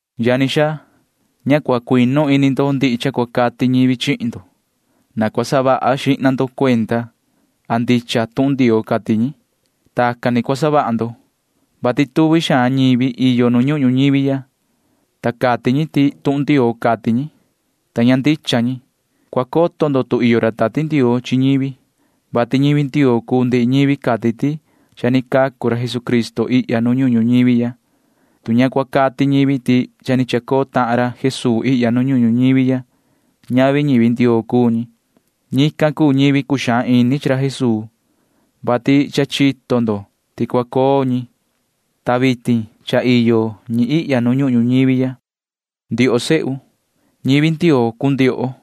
Yani xaa, ña cua cuinu ini ndo ndihi cha cua cati ñivi chihin ndo. Na cua saha vaha xihna ndo cuenda a ndicha tuhun Ndioo cati ñi. Tacan ni cua savaha ndo, vati tuvi xaan ñivi iyo nu ñuhun ñuñivi ya, ta cati ñi ti tuhun Ndioo cati ñi, ta ña ndicha ñi. Cua coto maan ndo tu iyo ra Tati Ndioo chi ñivi, vati ñivi Ndioo cuu ndihi ñivi cati ti cha ni cacu tahan ra Jesucristo ihya nu ñuhun ñuñivi ya. Tu ña cua cati ñivi ti cha ni chacoo tahan ra Jesuu ihya nu ñuhun ñuñivi ya, ñavi ñivi Ndioo cuu ñi. Ñican cuu ñivi cuxaan ini chi ra Jesuu, vati cha chito ndo ti cua coo ñi, ta vitin cha ni iyo ñi ihya nu ñuhun ñuñivi ya. Ndioho sehu, ñivi Ndioo cuu ndioho,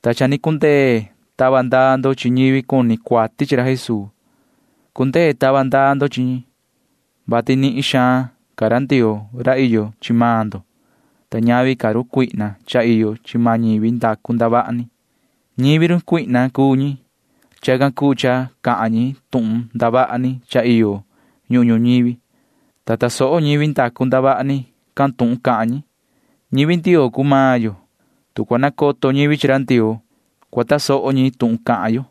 ta cha ni cundee tava ndaa ndo chi ñivi cuni cuati chi ra Jesuu. Cundee tava ndaa ndo chi ñi, vati nihin xaan ca ra Ndioo ra iyo chi maan ndo, ta ñavi ca sa run cuihna cha iyo chi maan ñivi ndacu ndavaha ni. Ñivi run cuihna cuu ñi. Chacan cuu cha cahan ñi tuhun ndavaha ni cha iyo ñuhun ñuñivi, ta tasoho ñivi ndacu ndavaha ni can tuhun cahan ñi. Ñivi Ndioo cuu maan yo. Tu cua nacoto ñivi chi ra Ndioo, cua tasoho ñi tuhun cahan yo.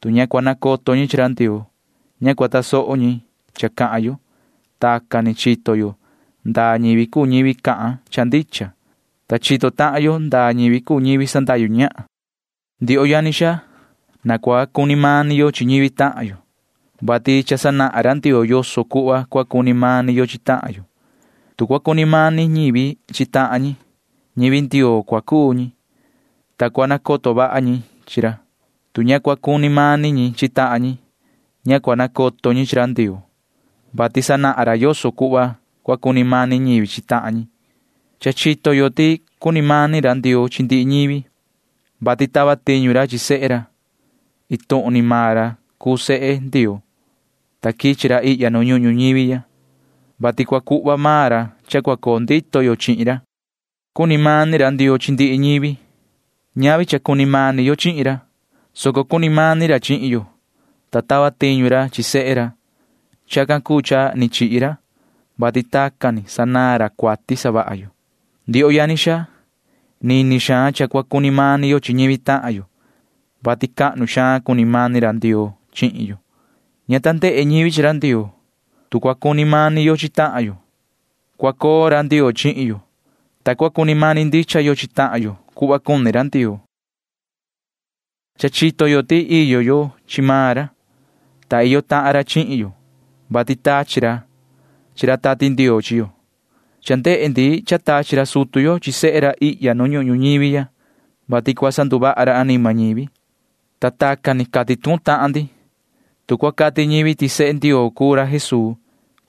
Tu ña cua nacoto ñi chi ra Ndioo, ña cua tasoho ñi cha cahan yo. Tacan ni chito yo ndaa ñivi cuu ñivi cahan cha ndicha, ta chito tahan yo ndaa ñivi cuu ñivi sandahyu ñahan. Ndioho yani xaa, na cua cuni mani yo chi ñivi tahan yo, vati cha sanahan maan ra Ndioo yoso cuhva cua cuni mani yo chi tahan yo. Tu cua cuni mani ñivi chi tahan ñi, ñivi Ndioo cua cuu ñi, ta cua nacoto vaha ñi chi ra. Tu ña cua cuni mani ñi chi tahan ñi, ña cua nacoto ñi chi ra Ndioo, vati sanahan ra yoso cuhva cua cuni mani ñivi chi tahan ñi. Cha chito yo ti cuni mani ra Ndioo chi ndihi ñivi, vati tava tiñu ra chi sehe ra. Iin tuhun ni maan ra cuu sehe Ndioo, ta quichi ra ihya nu ñuhun ñuñivi ya, vati cua cuhva maan ra cha cua coo ndito yo chihin ra. Cuni mani ra Ndioo chi ndihi ñivi. Ñavi cha cuni mani yo chihin ra, soco cuni mani ra chihin yo, ta tava tiñu ra chi sehe ra. Chacan cuu cha ni chihi ra, vati tacan ni sanaan ra cuati savaha yo. Ndioho yani xaa, nini xaan cha cua cuni mani yo chi ñivi tahan yo, vati cuaha xaan cuni mani ra Ndioo chihin yo. Ña ta ndehe ñivi chi ra Ndioo. Tu cua cuni mani yo chi tahan yo, cua coo ra Ndioo chihin yo, ta cua cuni mani ndicha yo chi tahan yo cuhva cuni ra Ndioo. Cha chito yo ti iyo yo chi maan ra, ta iyo tahan ra chi maan yo, vati tachi ra chi ra Tati Ndioo chihin yo. Cha ndehe ndi cha tachi ra sutu yo chi sehe ra ihya nu ñuhun ñuñivi ya, vati cua sanduvaha ra anima ñivi, ta tacan ni cati tuhun tahan ndi. Tu cua cati ñivi ti sehe Ndioo cuu ra Jesuu,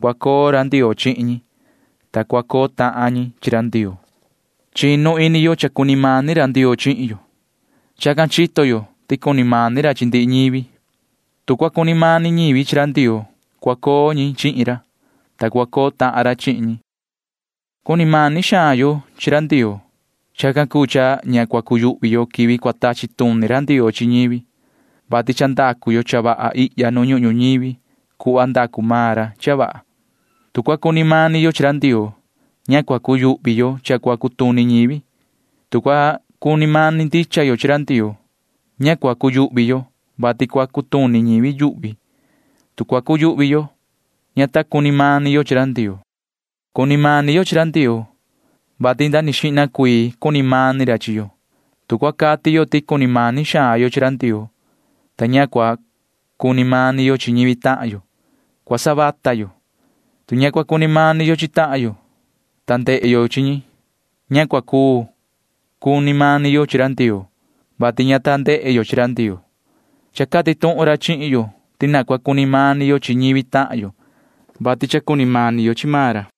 cua coo ra Ndioo chihin ñi, ta cua coo tahan ñi chi ra Ndioo. Chinu ini yo ti cha cuni mani ra Ndioo chihin yo. Chacan ni chito yo ti cuni mani ra chi ndihi ñivi. Tu cua cuni mani ñivi chi ra Ndioo, cua coo ñi chihin ra, ta cua coo tahan ra chihin ñi. Vaha xaan cuni mani yo chi ra Ndioo. Chacan cuu cha ña cua cuyuhvi yo quivi cua tachi tuni ra Ndioo chi ñivi, vati cha ndacu yo cha vaha ihya nu ñuhun ñuñivi cuhva ndacu maan ra cha vaha. Tu cua cuni mani yo chi ra Ndioo, ña cua cuyuhvi yo cha cua cutuni ñivi. Tu cua cuni mani ndicha yo chi ra Ndioo, ña cua cuu cuyuhvi yo, vati cua cutuni ñivi yuhvi. Tu cua cuyuhvi yo, ña ta cuni mani yo chi ra Ndioo. Cuni mani yo chi ra Ndioo, vati nda xihna ca cuni mani ra chi maan yo. Tu cua cati yo ti cuni mani xaan yo chi ra Ndioo, ta ña cua cuni mani yo chi ñivi tahan yo, vata xaan yo cua cuu. Tu ña cua cuni mani yo chi tahan yo, ta cha ni ndehe yo chi ñi, ña cua cuu cuni mani yo chi ra Ndioo, vati ña ta ndehe yo chi ra Ndioo. Cha cati tuhun maan ra chihin yo ti na cua cuni mani yo chi ñivi tahan yo, vati cha ni cuni mani yo chi maan ra.